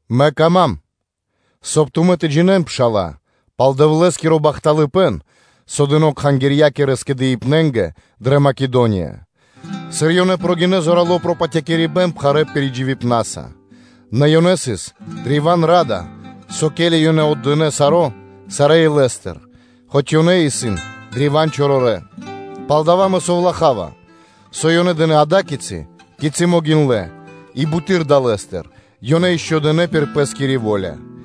Мэ кама́м, соб (кай) тумэ́ тэ джинэ́н, пшала́лэ, пал Дэвлэ́скиро бахталыпэ́н, со дыно́ кхангирья́кирэ скэдыибнэнгэ дрэ Македония, сыр ёнэ прогинэ́ зорало́ пропатякирибэн пхарэ́ пиридживибна́са, нэ ёнэ сыс древа́н ра́да, со ке́ли ёнэ отдынэ́ саро́ сарэ́ илэ́стыр, хоць ёнэ исын древа́н чорорэ́, палдава́ мэ совлахава, со ёнэ дынэ́ ада́кицы, кицы́ могиндлэ́, и буты́р далэ́стыр, ёнэ ишчо (инкэ́) дынэ́ пир пэ́скири во́ля,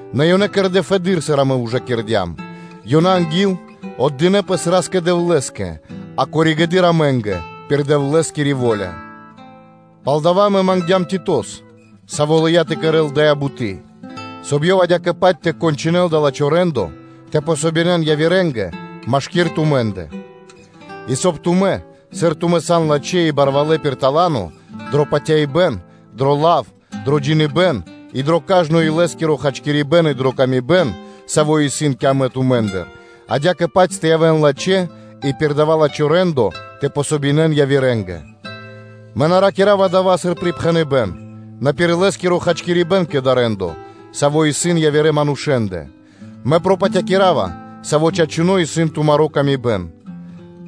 Нэ ёнэ кэрдэ́ фэды́р, сыр амэ ужакирдям лачхипэ́н; ёнэ анги́л отдынэ́ пэс Ра́скэ-Дэвлэ́скэ, а коригэды́р амэ́нгэ пир Дэвлэ́скири во́ля. Палдава́ амэ мангдям Титос, саво́ лыя́ тэ кэрэ́л дая́ буты́, соб (кай) ёв адя́кэ-паць тэ кончынэл дава́ лачхо́ рэ́ндо тэ помогинэн явирэ́нгэ машки́р тумэ́ндэ; и соб (кай) тумэ́, сыр тумэ́ сан лачхэ́ и барвалэ́ пир тала́но (дарованиё): дро патяибэ́н, дро лав, дро джиныбэ́н и дро кажно илэ́скиро хачкирибэ́н и дрэ ла́ска и паты́в, савэ́ исын кэ амэ тумэ́ндыр, адя́кэ-паць тэ явэ́н лачхэ́ и пир дава́ лачхо́ рэ́ндо тэ ден васт явирэ́нгэ. Мэ на ракира́ва дава́ сыр припхэныбэ́н, нэ пир илэ́скиро хачкирибэ́н кэ дава́ рэ́ндо, саво́ исын явирэ манушэ́ндэ, мэ пропатякирава, савэ́ чачунэ́ исын тумарэ́ ла́ска и паты́в.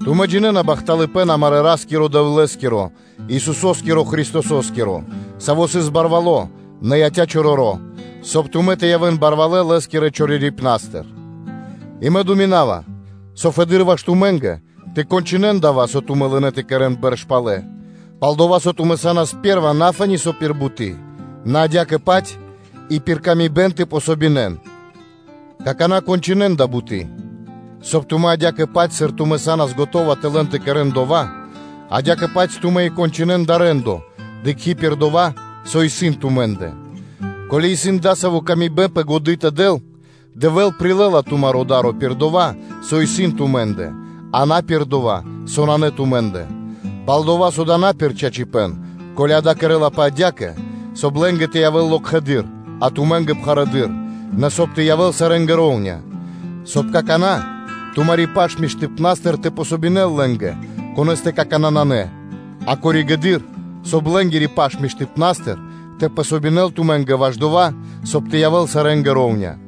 Тумэ́ джинэ́на бахталыпэ́н амарэ́ Ра́стыр-Дэвлэ́стыр, саво́ исын Исусо́скиро Христосо́скиро, Саво́ сыс барвало́, нэ яця́ чороро́, соб (кай) тумэ́ тэ явэ́н барвалэ́ Лэ́скирэ чорорипнастыр. И мэ думинава, со фэды́р ваш тумэ́нгэ тэ кончынэн дава́, со тумэ́ лынэ́ тэ кэрэ́н бэрш палэ, пал-дова́ со тумэ́ са́нас пэ́рва на фэ́ни со пир буты́, нэ адя́кэ-паць и пир тырдыпэ́н тэ дэн васт. Какана́ кончынэн дая́ буты́: соб (кай) тумэ́ адя́кэ-паць сыр тумэ́ са́нас скэдынэ́ тэ лэн тэ кэрэ́н дова́, адя́кэ-паць тумэ́ и тэ кончынэн дава́ рэ́ндо, дыкхи́ пир дова́, со исын тумэ́ндэ. Ко́ли исын дасави́ мы́сля пэ годы́ тэ дэл, Дэвэ́л прилэ́ла тумаро́ да́ро пир дова́, со исын тумэ́нгэ, а на пир дова́, со нанэ тумэ́ндэ. Палдава́ со дава́ исын на пир чачипэ́н, ко́ли дава́ кэрлапэ адя́кэ, соб (кай) лэ́нгэ тэ явэ́л локхэды́р, а тумэ́нгэ пхарэдыр, нэ соб (кай) тэ явэ́л сарэ́нгэ роўня, соб (кай) какана́ тумари́ паш миштыпна́стыр тэ дэл васт лэ́нгэ, конэ́стэ какана́ нанэ, а коригэды́р, соб (кай) лэ́нгири паш миштыпна́стыр тэ дэл васт тумэ́нгэ ваш дова́, соб (кай) тэ явэ́л сарэ́нгэ шэра́ (ра́внэс).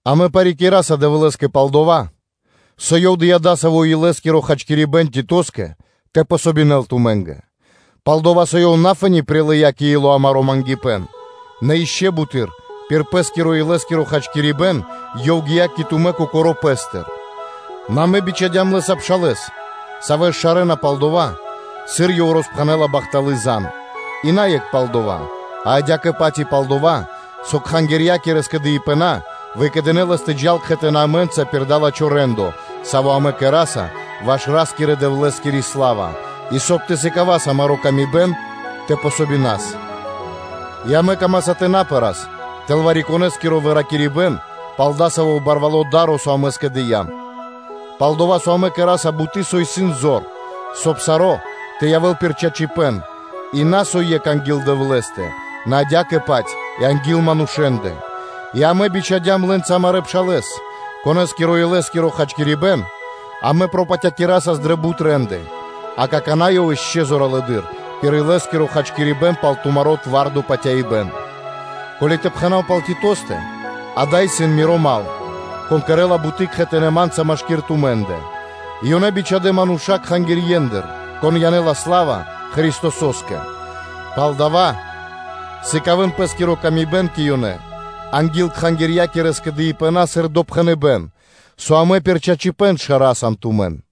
Амэ парикираса Дэвлэ́скэ пал дова́, со Ёв дыя́ дасаво илэ́скиро хачкирибэ́н Титоскэ тэ дэл васт тумэ́нгэ. Пал-дова́ со ёв на фэ́ни прилыя́ кэ ило́ амаро́ мангипэ́н (просьба), нэ ишчо (инкэ́) буты́р пир пэ́скиро илэ́скиро хачкирибэ́н, ёв гия́ кэ тумэ́ кокоро́ пэ́стыр; нэ амэ бичхадям лэ́са пшалэ́с, савэ́с шарэна пал дова́, сыр ёв роспхэнэ́ла бахталы́ зан, и на екх пал дова́, а адя́кэ-паць и пал дава́, со кхангирья́кирэ скэдыибэна выкэдынэ́ лэс тэ джал кхэтанэ́ амэ́нца пир дава́ лачхо́ рэ́ндо, саво́ амэ кэра́са ваш Ра́скирэ-Дэвлэ́скири сла́ва; и, соб (кай) тэ сыкавас амаро́ хачкирибэ́н тэ дас васт; и амэ камаса тэ на пэрас тэл вари-конэ́скиро выракирибэн пал дасаво барвало́ да́ро, со амэ скэдыям; пал-дова́ со амэ кэра́са буты́, со исын зор, соб (кай) саро́ тэ явэ́л пир чачипэ́н на со екх анги́л Дэвлэ́стэ, нэ адя́кэ-паць и анги́л манушэ́ндэ. И амэ бичхадям лэ́нца амарэ́ пшалэ́с, конэ́скиро илэ́скиро хачкирибэ́н амэ пропатякирасас дрэ бут рэ́нды, а какана́ ёв ишчо (инкэ́) зоралэды́р пир илэ́скиро хачкирибэ́н пал тумаро́ твардо патяибэ́н. Ко́ли тэ пхэна́в пал Титостэ, адава́ исын миро мал, кон кэрэ́ла буты́ кхэтанэ́ ма́нца машки́р тумэ́ндэ; и ёнэ исын бичхадэ́ мануша́ кхангирьендыр, кон янэ́ла сла́ва Христосо́скэ. Палдава́ сыкавэ́н пэ́скиро ило́ кэ ёнэ анги́л кхангирья́кирэ скэдыибэна сыр допхэныбэ́н, со амэ пир чачипэ́н шараса тумэн.